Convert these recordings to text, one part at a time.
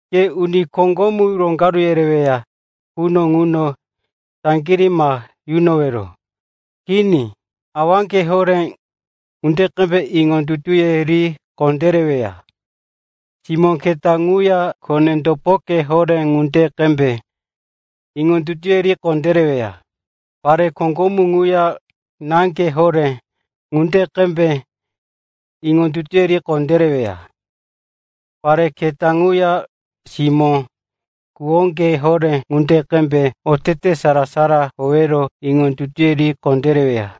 Ke uni koŋgomu roŋgaru yereweya quno ŋuno saŋgirí ma yunowero. Kini, awaŋge horé ŋunde qembe iŋondutuye ri kondéreweya. Simó keta ŋuya kone-topoke horé ŋunde qembe iŋondutuye ri kondéreweya. Pare koŋgomu ŋuya náŋge horé ŋunde qembe iŋondutuye ri kondéreweya. Pare keta ŋuya simó-kuwoŋge horé ŋunde qembe otete sara-sara howero iŋondutuye ri kondéreweya.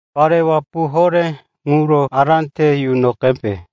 Pare wapu horé ŋuro ará te yuno qembe.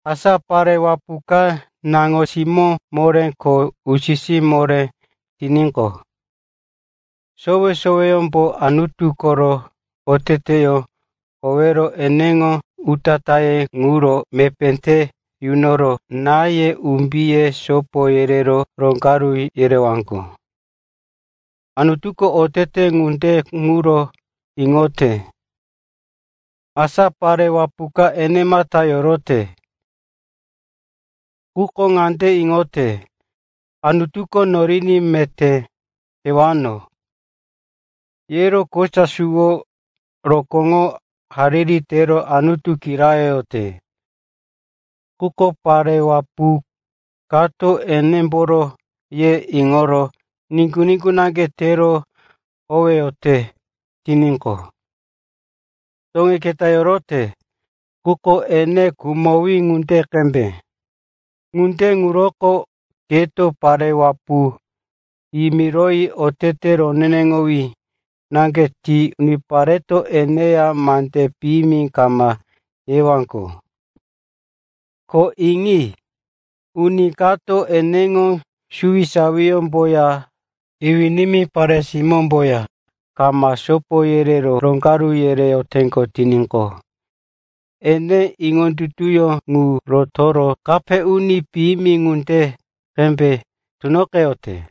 Asa pare wapu ka naŋo-simó moré ko usi-sí moré tiníqo, sowe-soweyómbo Anutu koro oteteyó howero eneŋo utatáye ŋuro mepé te yunoro náye, umbiye sopo yerero roŋgaru yerewaŋgo. Anutuko otete ŋunde ŋuro iŋote. Asa pare wapu horé ka enemata yorote, quko ŋande iŋote, “Anutuko noriní meté tewano,” yero kosa suwo rokóŋoro hariri tero Anutu kirayoyote. Quko pare wapu kato eneŋomboro ye iŋoro niŋgu-niŋgu naŋge tero howeyote tiníqo, toŋí keta yorote, quko ene khumowí ŋunde qembe. Ŋunde ŋuroko keto pare wapu yimiroyi otete roneneŋowí naŋge ti unipareto eneya mande piyimi kama yewaŋgo. Ko iŋi. Uni kato eneŋo suwisawiyómboya iwí-nimí pare-simómboya kama sopo yerero roŋgaru yereyote tiníqo, ene iŋondutuyó ŋu rotoro, kape uni piyimi ŋunde qembe tunoqeyote.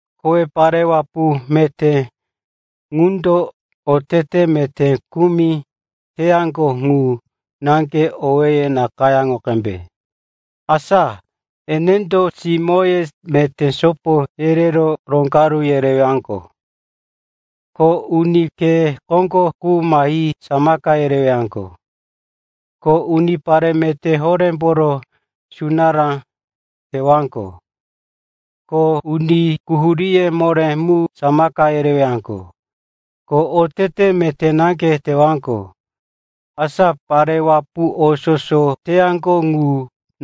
Kowe pare wapu meté ŋundo otete meté kumi teyaŋgo ŋu naŋge owéye nakayáŋo qembe. Asa enendo simóye meté sopo yerero roŋgaru yereyaŋgo, ko uni khe koŋgo qu mahi samaka yereyaŋgo, ko unipare meté horémboro sunará teyaŋgo, ko uni quhuríye moré mu samaka yereyaŋgo, ko otete meté naŋge teyaŋgo. Asa pare wapu o soso teyaŋgo ŋu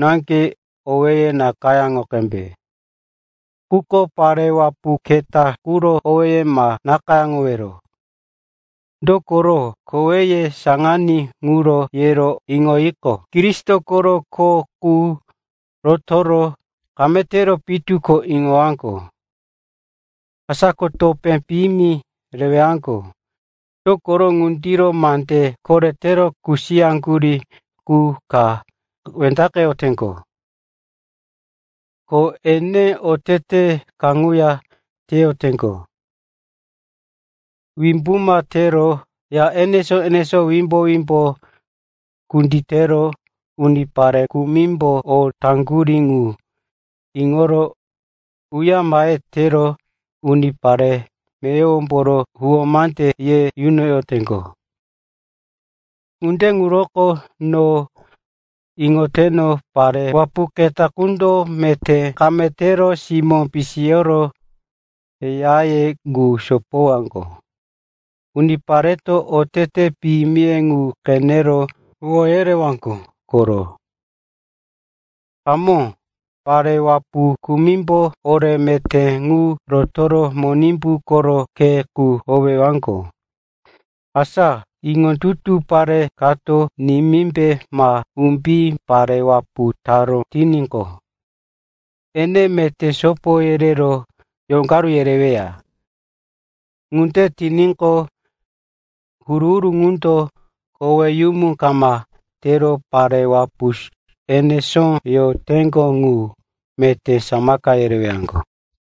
naŋge owéye nakayáŋo qembe. Quko pare wapu keta quro owéye ma nakayáŋowero. Dokoro koweye saŋaní ŋuro yero iŋoyiqo, Kristo koro kho qu rotoro kame tewero pitu ko iŋowaŋgo. Asa ko topé piyimi rewaŋgo, dokoro ŋundiro mande koretero kusiyaŋgurí qu ka wendaqeteŋgo. Ko ene otete kaŋuya teyoteŋgo. Wimbuma tero ya enesó-enesó ŋuno wimbo-wimbo kunditero unipare kumimbo o teyaŋgo ŋu iŋoro uyare mahe tero unipare meyowomboro huwó mande ye yunoyoteŋgo. Ŋunde ŋuroko no iŋoteno pare wapu keta qundo meté kame tero simó pisiyoro yaye ŋu sopowaŋgo. Unipareto otete piyimiye ŋu qenero huwó yerewaŋgo koro. Hamó, pare wapu kumimbo ore meté ŋu rotoro Monimbu koro khe qu howeyaŋgo. Asa iŋondutu pare kato nimímbe ma umbí pare wapu taró tiníqo, ene meté sopo yerero roŋgaru yereweya. Ŋunde tiníqo, huru-huru ŋundo koweyumu kama tero pare wapu enesó yoroteŋgo qu meté samaka yerewaŋgo.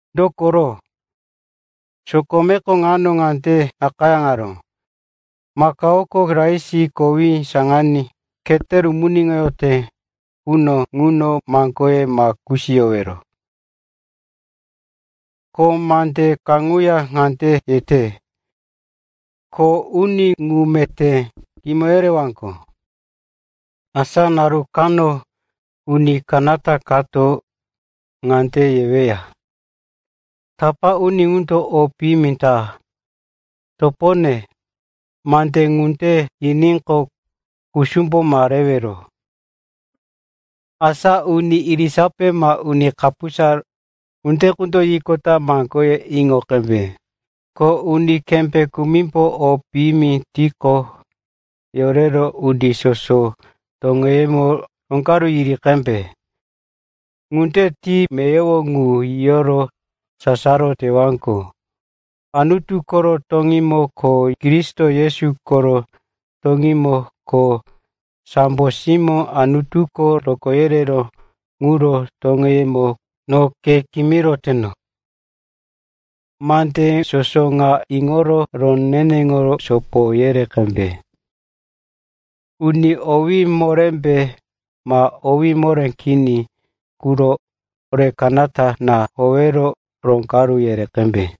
Dokoro sokomeko ŋuno ŋande nakayáŋaró, “Makaoko rais kowí khete rumuniŋoyote quno ŋuno maŋgoye ma kusiyowero.” Ko mande kaŋuya ŋande yete, “Kho uni ŋu meté kimoye rewaŋgo.” Asa naru kano uni kanata kato ŋande yeweya, “Tapá uni ŋundo o piyimi ta.” Topone, mande ŋunde yiníqo, kusumbo ma rewero. Asa uni irisape ma uni kapusa ŋunde qundo yiqota maŋgoye iŋo qembe. Ko uni kembé kumimbo o piyimi tiqo, yorero uni soso toŋeyemo roŋgaru yere qembe. Ŋunde ti meyowo ŋu yiyoro sasaro tewaŋgo. Anutu koro toŋímo ko Kristo Yesu koro toŋímo ko sambo simó Anutuko rokó yereró ŋuro toŋeyemo, no ke kimiroteno, mande soso ŋa iŋoro roneneŋo sopo yere qembe. Uni owí morémbe ma owí moré kini quro ore kanata na howero roŋgaru yere qembe.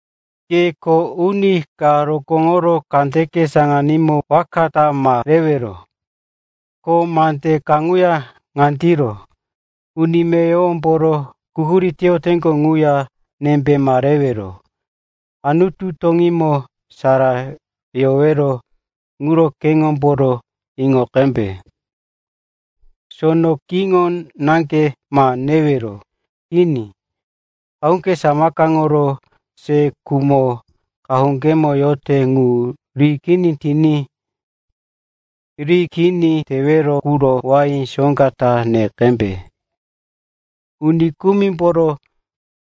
Ke kho uni ka rokóŋoro kandeke saŋanímo waka ta ma rewero. Ko mande kaŋuya ŋandiro, uni meyowomboro quhurí teyoteŋgo ŋuya nembe ma rewero. Anutu toŋímo sara yowero ŋuro keŋomboro iŋo qembe. Sono kiŋo naŋge ma newero. Kini, qahuŋge samakaŋoro se khumo qahuŋgemo yote ŋu riní kini tewero quro wain soŋga ta ne qembe. Uni kumimboro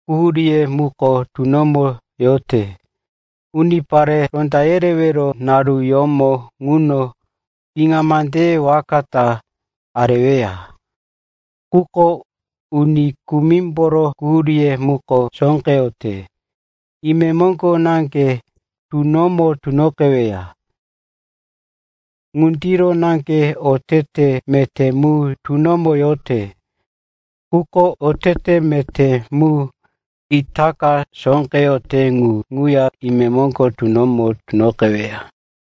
quhuríye muko tunomo yote, unipare ronda yerewero naruyómo ŋuno piŋa mandeye waka ta areweya. Quko uni kumimboro quhuríye muko sóqeyote. Imemoŋgo naŋge tunomo tunoqeweya. Ŋundiro naŋge otete meté mu tunomo yote. Quko otete meté mu itaka sóqeyote ŋu ŋuya imemoŋgo tunomo tunoqeweya.